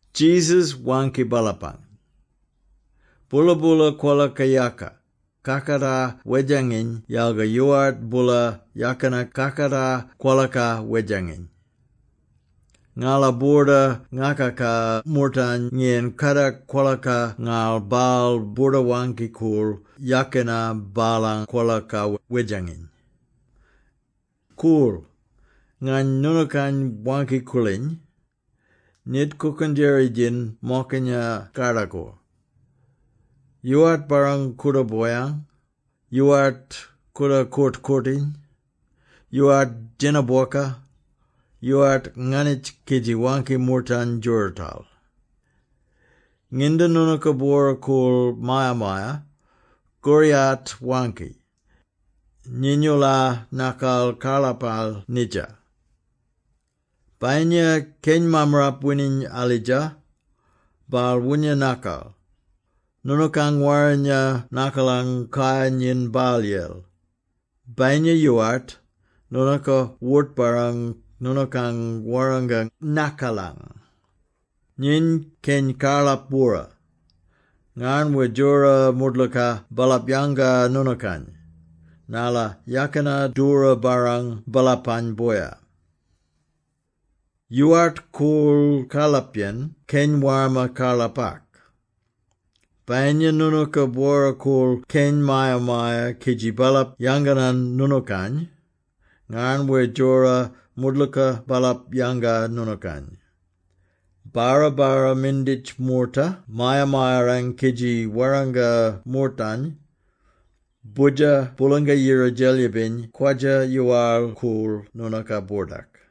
Jesus waangki baalapany, “Boola-boola kwolaka yaaka, kakatar wedjanginy yalga yoowart boola yakina kakatar kwolaka wedjanginy. Ngala boorda ngakaka moortany ngiyan kadak kwolaka ngarl baal boorda-waangki-koorl yakina baalang kwolaka wedjanginy. “Koorl! Ngany noonookany waangki-koorliny, nyit kookendjeri-djin mokinya kardakor. Yoowart barrang kooda boyang, yoowart kooda koort-koortiny, yoowart djena bwoka. Yoowart nganitj kidji waangki moortany djoorootal. Nginda noonooka bwora-koorl maya-maya, koriyat waangki, ‘Nyiny-oola nakal karlapal nidja.’ Bayinya keny mammarap wining alidja, baal woonya nakal, noonookang warrinya nakalang kayar nyin baalyel; bayinya yoowart, noonooka wort-barrang noonookang warranga nakalang. Nyiny keny karlap-bwora, ngarn wer djora moodlooka baalap yanga noonookany, narla yakina doora barrang baalapang boya. Yoowart koorl karlapyen keny warma karlapak. Bayinya noonooka bwora-koorl keny maya-maya kidji baalap yanganan noonookany, ngarn wer djora moodlooka baalap yanga noonookany. Barra-barra minditj moorta maya-mayarang kidji warranga moortany, ‘Boodjer Boolanga-Yira Djelyibiny kwadja-yoowal-koorl noonooka-boordak.’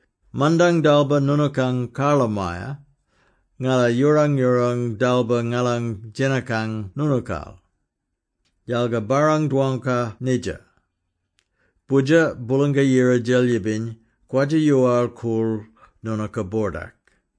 ‘Mandang dalba noonookang karlamaya, ngala yoorang-yoorang dalba ngalang djenakang noonookal. Yalga barrang-dwangka nidja! Boodjer Boolanga-Yira Djelyibiny kwadja-yoowal-koorl noonooka-boordak.’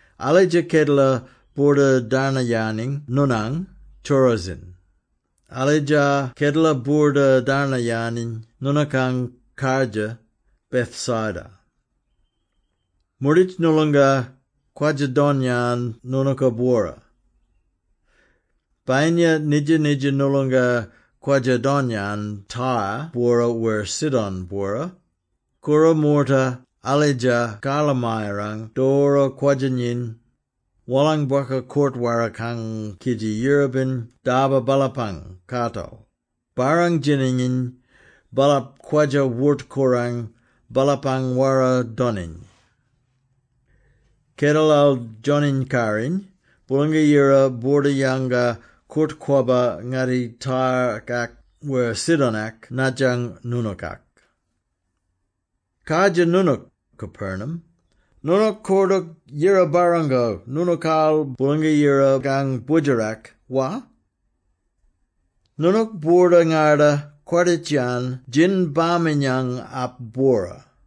“Alidja kedela boorda-darnayaniny noonang, Chorazin! Alidja kedela boorda-darnayaniny noonookang kardjir, Bethsaida! Moorditj noolonga kwadja-don-yan noonooka-bwora. Bayinya nidja-nidja noolonga kwadja-don-yan Tyre-bwora wer Sidon-bwora, koora moorta alidja karlamayarang doora kwadja-nyiny, wolang bwoka koort-warakang kidji yirrbin dalba baalapang kaatal, barrang-djinanginy baalap kwadja-wort-korang baalapang wara-doniny. Kedelal Djoniny-Karriny, Boolanga-Yira boorda-yanga koort-kwabba ngatti Tyre-kak wer Sidon-ak nadjang noonookak. “Kardjir noonook, Capernaum! Noonook koordook yira-barrango noonookaal Boolanga-Yirakang Boodjerak, wa? Noonook boorda-ngarda-kwarditj-yan Djinbaminyangap-bwora.”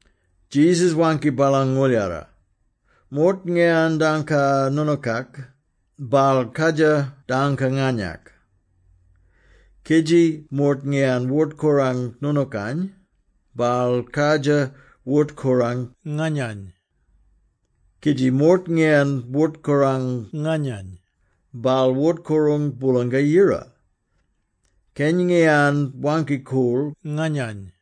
Jesus waangki baalang ngooldjara, “Moort ngiyan dangka noonookak, baal kardjir dangka nganyak; kidji moort ngiyan wort-korang noonookany, baal kardjir wort-korang nganyany. Kidji moort ngiyan wort-korang nganyany, baal wort-korang Boolanga-Yira, keny ngiyan waangki-koorl nganyany.”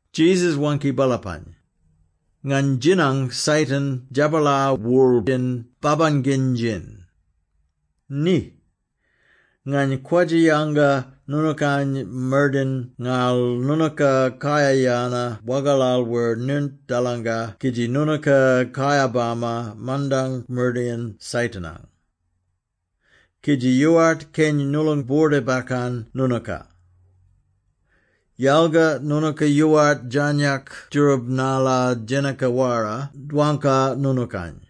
Jesus waangki baalapany, “Ngany djinang Satan djabalar worl-yen babanginy-djin! Ni! Ngany kwadja-yanga noonookany mardayin ngarl noonooka kayar-yana wagalal wer nirnt-daalanga kidji noonooka kayar-bama mandang mardayin Satan-ang. Kidji yoowart keny noolong boorda-bakkan noonooka. Yalga noonooka yoowart djarnyak djoorab narla djenaka-wara dwangka noonookany.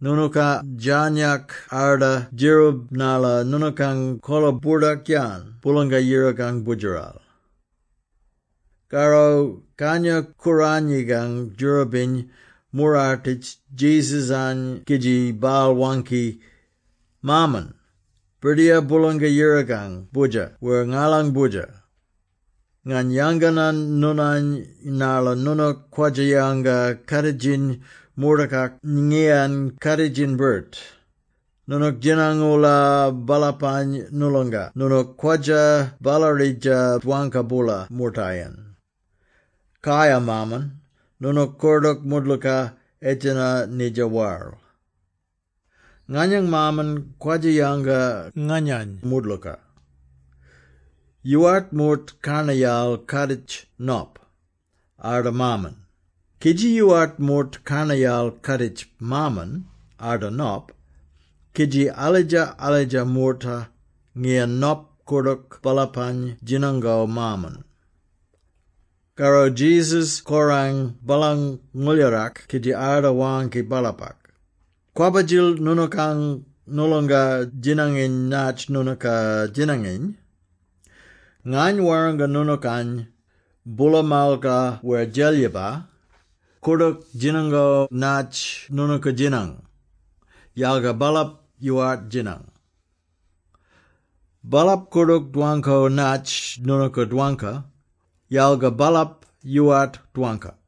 Noonooka djarnyak arda djeroob narla noonookang kola boordak-yan Boolanga-Yirakang Boodjeral.” Karro Kangya-Kooranyikang djoorabiny moorartitj Jesus-any kidji baal waangki, “Maaman, Birdiyar Boolanga-Yirakang Boodjer wer ngalang Boodjer! Ngany yanganan noonany narla noonook kwadja-yanga kaaditjiny moortakak ngiyan kaaditjiny-birt: noonook djinang-oola baalapany noolonga noonook kwadja ballaridja dwangka-boola moortayen. Kaya Maaman, noonook koordook moodlooka edjeno nidja waral. “Nganyang Maaman kwadja-yanga nganyany moodlooka. Yoowart moort karnayal kaaditj Nop, arda Maaman; kidji yoowart moort karnayal kaaditj Maaman, arda Nop, kidji alidja-alidja moorta ngiyan Nop koordook baalapany djinango Maaman.” Karro Jesus korang baalang ngooldjarak kidji arda waangki baalapak, “Kwabba-djil noonookang, noolonga djinanginy natj noonooka djinanginy! Ngany warranga noonookany, boola malka wer djelyiba, koordook djinango natj noonooka djinang, yalga baalap yoowart djinang. Baalap koordook dwangko natj noonooka dwangka, yalga baalap yoowart dwangka.”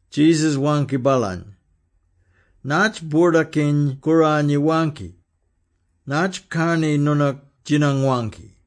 Jesus waangki baalany, “Natj Boordakiny-Kooranyi waangki? Natj karni noonook djinang-waangki?”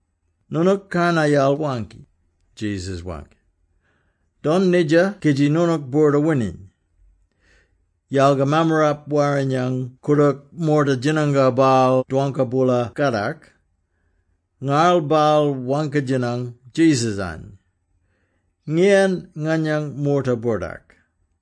“Noonook karnayal waangki,” Jesus waangki. “Don nidja kidji noonook boorda-wining.” Yalga Mammarap-Warrinyang koordook moorta djinango baal dwangka-boola kadak, ngarl baal waangki-djinang Jesus-any, “Ngiyan nganyang moorta-boordak?”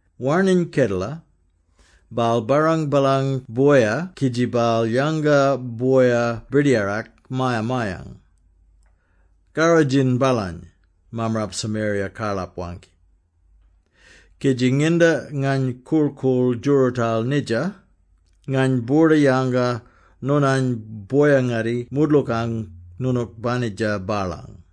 Warning Kedela, baal barrang baalang boya kidji baal yanga boya birdiyarak maya-mayang. ‘Karrodjin baalany,’ mammarap Samaria-karlap waangki, ‘kidji nginda ngany korl-koorl djoorootal nidja, ngany boorda-yanga noonany boya-ngatti moodlookang noonook banitja baalang.’”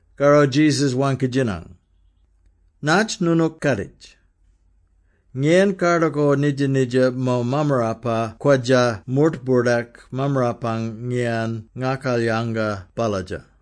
Karro Jesus waangki-djinang, “Natj noonook kaaditj? Ngiyan kardakor nidja-nidja mo mammarapa kwadja moort-boordak mammarapang ngiyan ngakalyanga balladja?”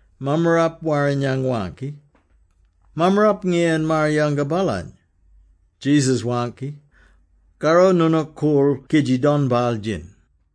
Mammarap-Warrinyang waangki, “Mammarap ngiyan maar-yanga baalany.” Jesus waangki, “Karro noonook koorl kidji don baal-djin.”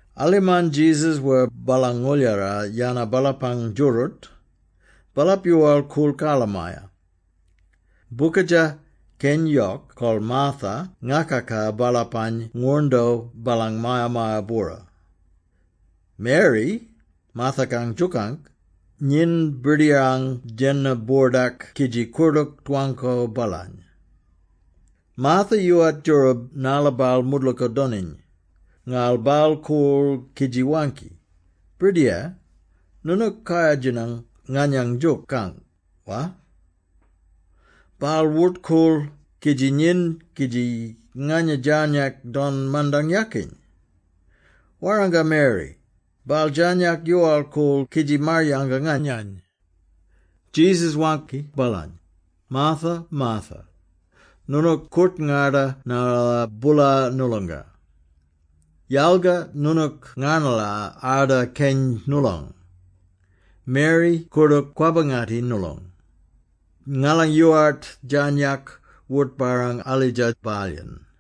Alimarn Jesus wer baalang ngooldjara yana baalapang djooroot, baalap yoowal-koorl karlamaya. Bokadja, keny yok kol Martha ngakaka baalapany ngwoorndo baalang maya-maya-bwora. Mary, Martha-kang djook, nyiny Birdiyar-ang djena-boordak kidji koordook dwangko baalany. Martha yoowart djoorab narla baal moodlooka doniny, ngarl baal koorl kidji waangki, “Birdiyar, noonook kayar-djinang nganyang djook, wa? Baal wort-koorl kidji nyiny kidji nganya djarnyak don mandang yakiny! Warranga Mary, baal djarnyak yoowal-koorl kidji maar-yanga nganyany!” Jesus waangki baalany, “Martha, Martha! Noonook koort-ngarda narla boola noolonga. Yalga noonook ngarnala arda keny noolong. Mary koordook kwabba-ngatti noolong. Ngala yoowart djarnyak wort-barrang alidja baalyen.”